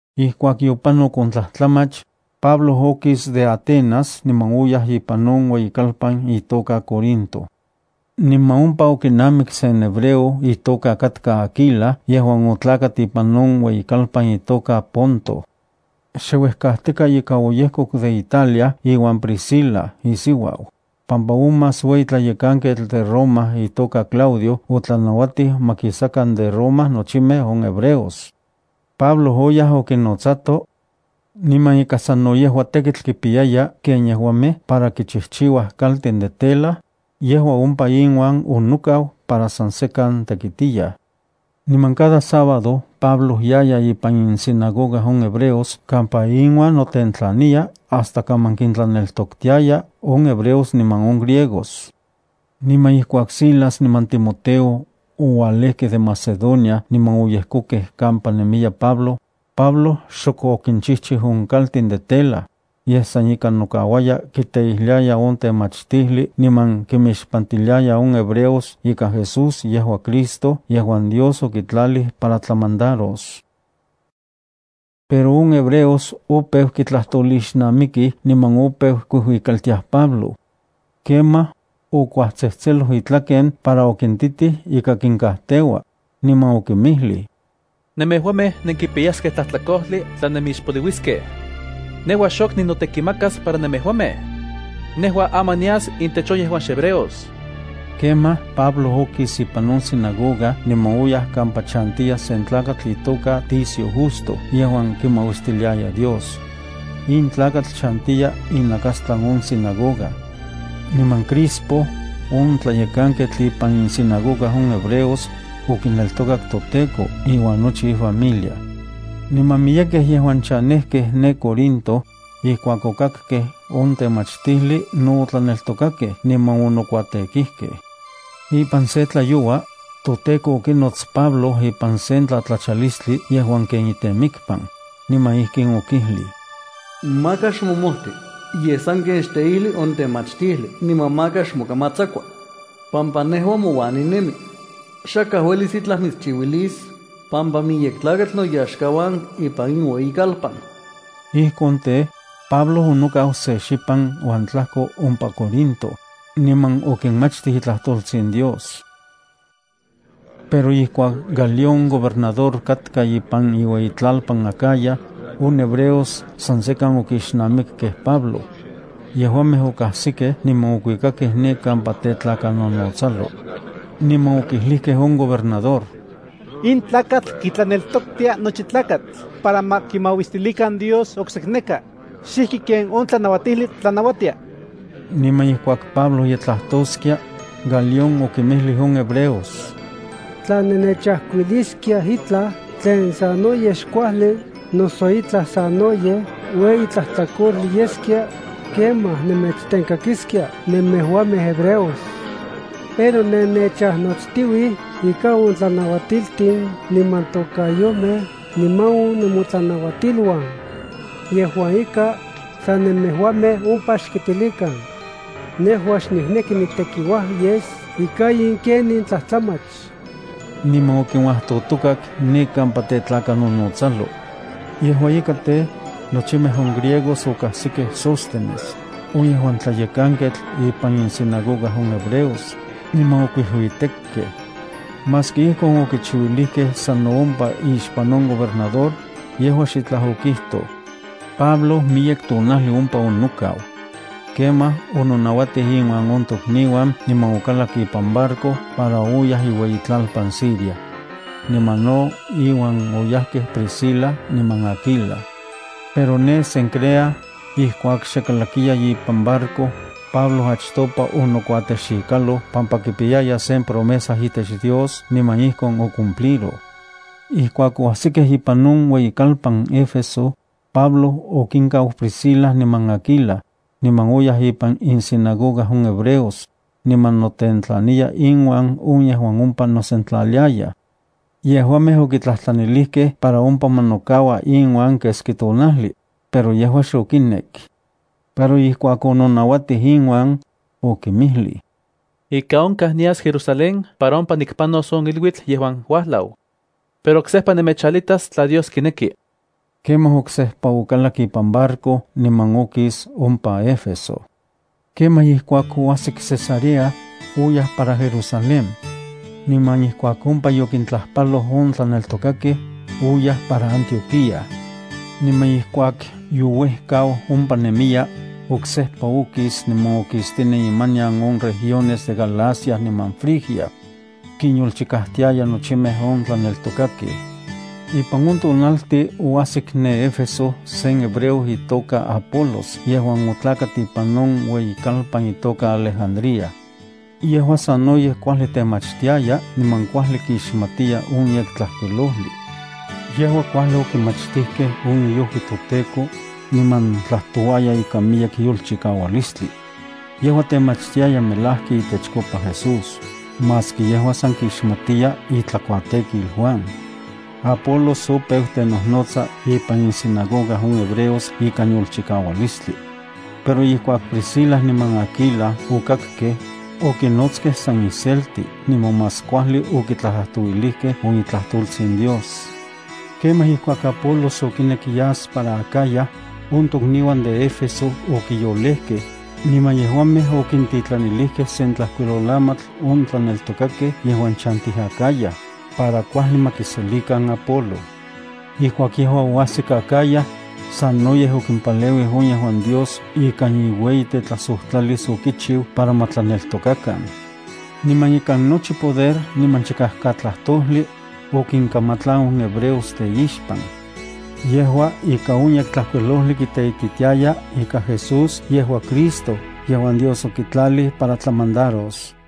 Ijkuak yopanok on tlajtlamach, Pablo okis de Atenas niman oyaj ipan on ueyikalpan itoka Corinto. Niman ompa okinamik sen hebreo itoka katka Aquila yejuan otlakat ipan on ueyitlalpan itoka Ponto. Xe uejkajtika ika oyejkok de Italia iuan Priscila isiuau, pampa on más ueyi tlayekanketl de Roma itoka Claudio otlanauatij ma kisakan de Roma nochimej on hebreos. Pablo oyaj okinnotsato, niman ika sano yejua tekitl kipiyaya ken yejuamej para kichijchiuaj kaltin de tela, yejua ompa inuan onokau para san sekan tekitiyaj. Niman cada sábado Pablo yaya ipan insinagoga on hebreos kampa inuan notentlaniya hasta kaman kintlaneltoktiaya on hebreos niman on griegos. Niman ijkuak Silas niman Timoteo ouajlajkej de Macedonia niman oyejkokej kampa nemiya Pablo, Pablo xok okinchijchiu on kaltin de tela, yej san ika nokauaya kiteijliaya on temachtijli niman kimixpantiliaya on hebreos ika Jesús yejua Cristo yejuan Dios okitlalij para tlamandaros. Pero on hebreos opeu kitlajtolixnamikij niman opeu kuijuikaltiaj Pablo. Kemaj, okuajtsejtseloj itlaken para okintitij ika kinkajteua, niman okinmijlij: —Nemejuamej nenkipiyaskej tlajtlakojli tla nemixpoliuiskej. Nejua xok ninotekimakas para nemejuamej. Nejua aman nias intech on yejuan xhebreos. Kemaj, Pablo okis ipan on sinagoga niman oyaj kampa chantiya sen tlakatl itoka Ticio Justo yejuan kimauistiliaya Dios. In tlakatl chantiya inakastlan on sinagoga. Niman Crispo, on tlayekanketl ipan insinagoga on hebreos, okineltokak toTEKO iuan nochi ifamilia. Niman miyekej yejuan chanejkej ne Corinto, ijkuak okakkej on temachtijli, no otlaneltokakej niman onokuatekijkej. Ipan sen tlayoua, toTEKO okinots Pablo ipan sen tlatlachalistli yejuan ken itemikpan, niman ijkin okijlij: —Maka xmomojti, yej sanken xteijli on temachtijli niman maka xmokamatsakua, pampa nejua mouan ninemi. Xakaj uelis itlaj mitschiuilis, pampa miyek tlakatl noyaxkauan ipan in ueyikalpan. Ijkon tej, Pablo onokau se xipan uan tlajko ompa Corinto, niman okinmachtij itlajtoltsin Dios. Pero ijkuak Galión gobernador katka ipan iueyitlalpan Acaya, on hebreos san sekan okixnamikkej Pablo. Yejuamej okajsikej niman okuikakej ne kampa tetlakanonotsalo. Niman okijlijkej on gobernador: —In tlakatl kitlaneltoktia nochi tlakatl para ma kimauistilikan Dios oksekneka, xijki ken on tlanauatijli tlanauatia. Niman ijkuak Pablo ye tlajtoskia, Galión okinmijlij on hebreos: —Tla nennechajkuiliskiaj itlaj tlen sanoyej xkuajli noso itlaj sanoyej ueyi tlajtlakojli yeskia, kemaj nemechtenkakiskia nemejuamej hebreos. Pero nennechajnotstiuij ika on temachtiltin niman tokayomej niman on nemotlanauatiluan. Yejua ika, san nemejuamej ompa xkitilikan. Nejua xnikneki nitekiuaj yes ika in ken in tlajtlamach. Niman okinuajtotokak ne kampa tetlakanonotsalo. Yejua ika tej, nochimej on griegos okajsikej Sóstenes, on yejuan tlayekanketl ipan insinagoga on hebreos, niman okuijuitekkej. Maski ijkon okichiuilijkej sano ompa ixpan on gobernador, yejua xitlaj okijtoj. Pablo miyek tonajli ompa onokau. Kemaj ononauatij inuan on tokniuan niman okalak ipan barco para oyaj iueyitlalpan Siria. Niman no iuan oyajkej Priscila niman Aquila. Pero ne Cencrea, ijkuak xe kalakiya ipan barco, Pablo achtopa onokuatexikaloj pampa kipiyaya sen promesa itech Dios niman ijkon ocumpliroj. Ijkuak oajsikej ipan on ueyikalpan Éfeso, Pablo okinkau Priscila niman Aquila, niman oyaj ipan insinagoga on hebreos, niman notentlaniya inuan on yejuan ompa nosentlaliayaj. Yejuamej okitlajtlanilijkej para ompa ma nokaua inuan keski tonajli, pero yejua xokinek. Pero ijkuak ononauatij inuan, okinmijlij: —Ika onkaj nias Jerusalén para ompa nikpanos on iluitl yejuan uajlau. Pero oksejpa nemechalitas tla Dios kineki. Kemaj oksejpa okalak ipan barco niman okis ompa Éfeso. Kemaj ijkuak oajsik Cesarea, oyaj para Jerusalén. Niman ijkuak ompa yokintlajpaloj on tlaneltokakej, oyaj para Antioquía. Niman ijkuak youejkau ompa nemiya, oksejpa okis niman okistinen imanian on regiones de Galacia niman Frigia. Kinyolchikajtiaya nochimej on tlaneltokakej. Ipan on tonaltin oajsik ne Éfeso sen hebreo itoka katka Apolos yejuan otlakat ipan on ueyikalpan itoka Alejandría. Yejua sanoyej kuajli temachtiaya niman kuajli kixmatiya on Yektlajkuilojli. Yejua kuajli okimachtijkej on iojui toTEKO, niman tlajtouaya ikan miyek yolchikaualistli. Yejua temachtiaya melajki itechkopa Jesús, maski yejua san kixmatiya itlakuatekil Juan. Apolos opeu tenojnotsa ipan insinagoga on hebreos ikan yolchikaualistli. Pero ijkuak Priscila niman Aquila okakkej, okinotskej san iselti niman más kuajli okitlajtlajtouilijkej on itlajtoltsin Dios. Kemaj ijkuak Apolos okinek yas para Acaya, on tokniuan de Éfeso okiyolejkej, niman yejuamej okintitlanilijkej sen tlajkuilolamatl on tlaneltokakej yejuan chantij Acaya, para kuajli ma kiselikan Apolo. Ijkuak yejua oajsik Acaya, sanoyej okimpaleuij on yejuan Dios ikan iueyitetlajsojtlalis okichiu para ma tlaneltokakan. Niman ikan nochi chikajkatlajtojli, okinkamatlan on hebreos teixpan. Yejua, ika on Yektlajkuilojli kiteititiaya ika Jesús yejua Cristo yejuan Dios okitlalij para tlamandaros.